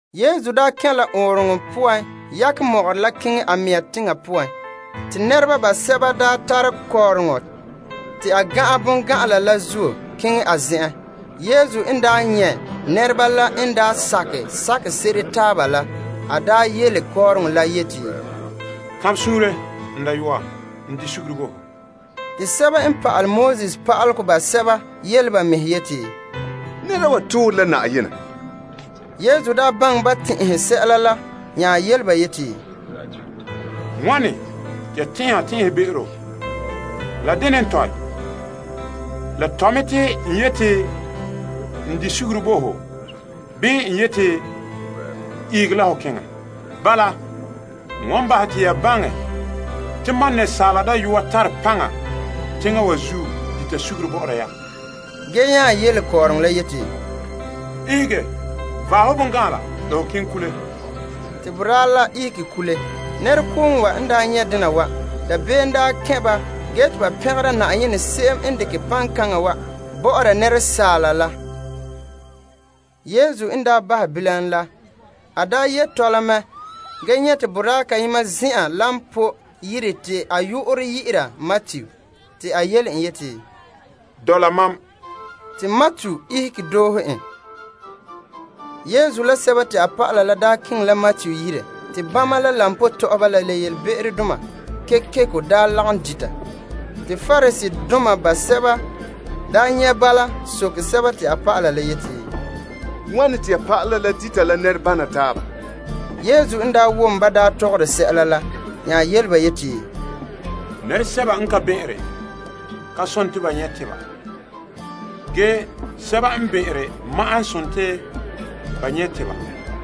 Yesu daa kɛn' la ɔɔnrɔŋɔ poan yakɛ mɔgɔrɛ la keŋɛ a mɛŋa teŋa poan. Te nɛreba basɛba tare kɔɔrɔŋɔ te a gan'an bongan'an la zuo keŋɛ a zen'en. Yesu n nyɛ' ba n daa sakɛ sakɛ se'ere taaba la, a yele kɔɔrɔŋɔ la yeti, Kanbɛ suunre, n dayɔa! N bahɛ ho be'em bo ho. Te pa'alegɔ pa'aleba basɛba yele ba mɛhe yeti, Nɛre'ena wa toore la Na'ayenɛ! Yesu baŋɛ ban tɛn'ɛhe sɛla la, nya yele ba yeti, Wane te ya tɛn'ɛhe tɛn'ɛbe'ero? La dene n tɔe? La tɔe mɛ te n yeti, n bahɛ ho be'em bo ho, bii n yeti, ihege la ho keŋɛ? Bala, n wan bahɛ te ya baŋɛ te Asaala Dayɔa tare paŋa teŋa wa zuo te n bahɛ nɛreba be'em bɔ'ɔra ba. Ge te a nya yele kɔɔrɔŋɔ la yeti, Ihege vaɛ ho bongan'an la kule. Te boraa la ihege kule. Nɛrekooŋɔ wa n nyɛ' dena wa, dabeem kɛn' ba ge te ba pɛngera Na'ayenɛ se'em n dekere paŋkana wa bɔ'ɔra asaala la. Yesu n daa bahɛ bilam la, a ye' tɔla mɛ ge nyɛ' te boraa kayema zin'an koba to'ohego yire te a yu'urɛ dɛna Matu. Te a yele en yeti, Doohe mam. Te Matu ihege doohe en. Yesu la a dɔlɔba la keŋɛ la Matu yire, te bama la koba tɔ'ɔhɔba la be'emdoma kekeko lagom dita. Te Pariseedoma basɛba nyɛ' bala soke te a dɔlɔba la yeti, Wane te ya pa'ala la dita la nɛrebana taaba? Yesu wom ban tɔgɔre sɛla nya yele ba yeti, Nɛresɛba n ka bɛn'ɛnre, ka sontii ba nyɛ' tebedoma, ge sɛba n bɛn'ɛnre ma'an n sontii ba nyɛ' tebedoma.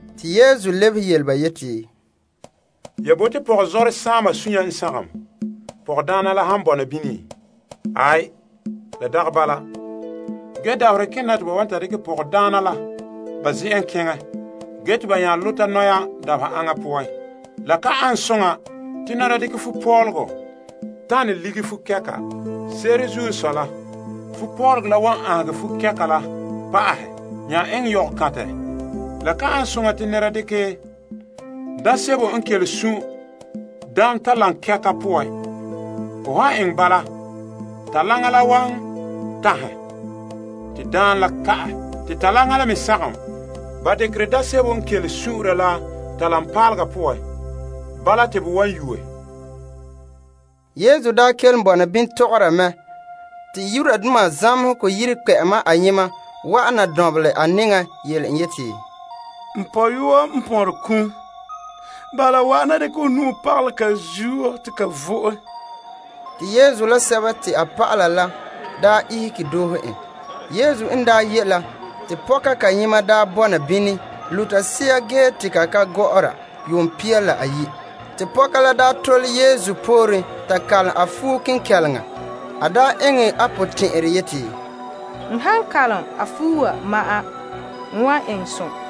Te Yesu lebehe yele ba yeti, Ya bote te pɔgɔzɔrɛ saama sunya n sagom pɔgɔdaana la han bɔna bini? Aai, la dagɛ bala. Ge dabaherɛ kena te ba wan ta dekɛ pɔgɔdaana la ba zen'en keŋɛ ge te ba nya zagahɛ ba mɛhe dabeha aŋa poan. La ka ane soŋa te nɛra dekɛ fupɔlɔgɔ tanɛ lige fukɛka. Se'ere n sɔe la, fupɔlɔgɔ la wan aanhegɛ fukɛka la pa'ahɛ nya eŋɛ yogokantɛ. La ka ane soŋa te nɛra dekɛ daam sebo n kele sun' daamtalankɛka poan. Ho han eŋɛ bala, talaŋa la wan tanhɛ te daam la ka'ɛ, te talaŋa la me sagom. Ba dekerɛ daam sebo n kele sun'unra la talaŋpaalega poan, bala te bo wan yuuɛ. Yesu daa kelom bɔna bini tɔgɔra mɛ, te zamehegɔ yire kpɛ'ɛma ayema wa'ana dɔnbelɛ a nɛŋan yele en yeti, N pɔyɔa n pon ki'. Bala wa'ana la ho dekɛ ho nu'o pagalɛ a zuo te a vo'e. Te Yesu la a dɔlɔba la ihege doohe en. Yesu n daa ye' la, te pɔka kayema bɔna bini te a luta sea ge te la ka gɔ'ɔra yuum pia la ayi'. Te pɔka la tole Yesu pooren ta kalom a fuo kenkɛleŋa. A eŋɛ a potɛn'ɛrɛ yeti, N han kalom a fuo wa ma'an, n wan eŋɛ som.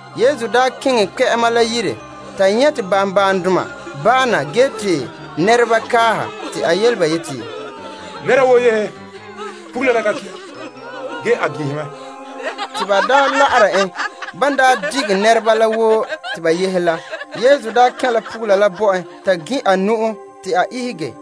Yesu n keŋɛ kpɛ'ɛma la yire ge nyɛ' te banbaandoma baana ge te nɛreba kaaha, a yele ba yeti, Nɛra woo yehe. Pugula la ka ki', ge a ginhi mɛ. Te ba zan'an la'ara en. Ba dige nɛreba la woo te ba yehe la, te Yesu kɛn' la pugula la bɔ'en ta gin' a nu'o te a ihege.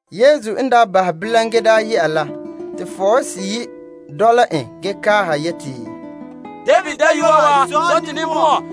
Yesu n daa bahɛ bilam ge daa yɛ'a la, te fɔɔhe seyi' dɔla en ge kaaha yeti, David dayɔa wa, zɔ' to ninbɔn'ɔn.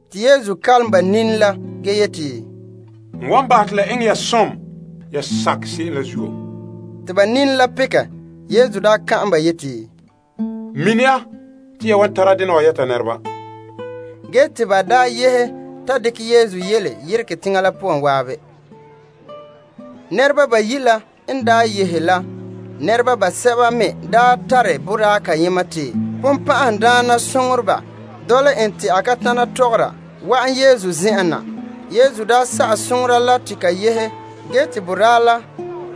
Te Yesu kalom ba nini la ge yeti, La eŋɛ ya wo yan sakɛ se'em la. Te ba nini la pekɛ. A daa ka'an ba yeti, Mini ya te ya wan tara dena wa yɛta nɛreba. Ge te ba yehe ta dekɛ Yesu yele yeregɛ teŋa la poan zan'an. Nɛreba bayi' la n daa yɛ'ɛha la, nɛreba basɛba me n tare boraa kayema te bonbɛ'ɛhe dɔla en te a ka tana tɔgɔra wa'an Yesu zen'en na. Yesu n sa'ɛ bonbɛ'ɛhe la te ka yehe, boraa la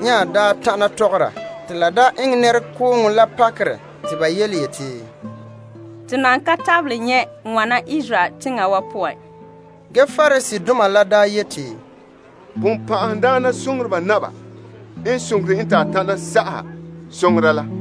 nya daa tana tɔgɔra. Te la daa eŋɛ nɛrekooŋɔ la pakerɛ te ba yeti, To nan ka tabelɛ nyɛ' wana Israel teŋa wa poan. Ge Pariseedoma la yeti, Bonbɛ'ɛhe naba n soŋore en te a tana sa'aha bonbɛ'ɛhe la.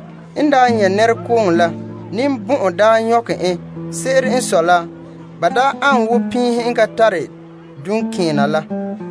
En nyɛ' nɛrekooŋɔ la, ninbɔn'ɔn daa nyɔkɛ en. Se'ere n sɔe la, ba tarege mɛ ge banlɛ ana woo piihe n ka tare duŋkeena la.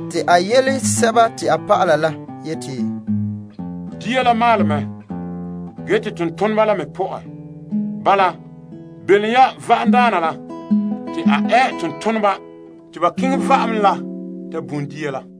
Te a yele a dɔlɔba la yeti, Dia la maalɛ mɛ, ge te tontoneba la me pɔ'ɛ. Bala, belom ya va'amdaana la te a ɛ tontoneba te ba keŋɛ va'am la ta bum dia la.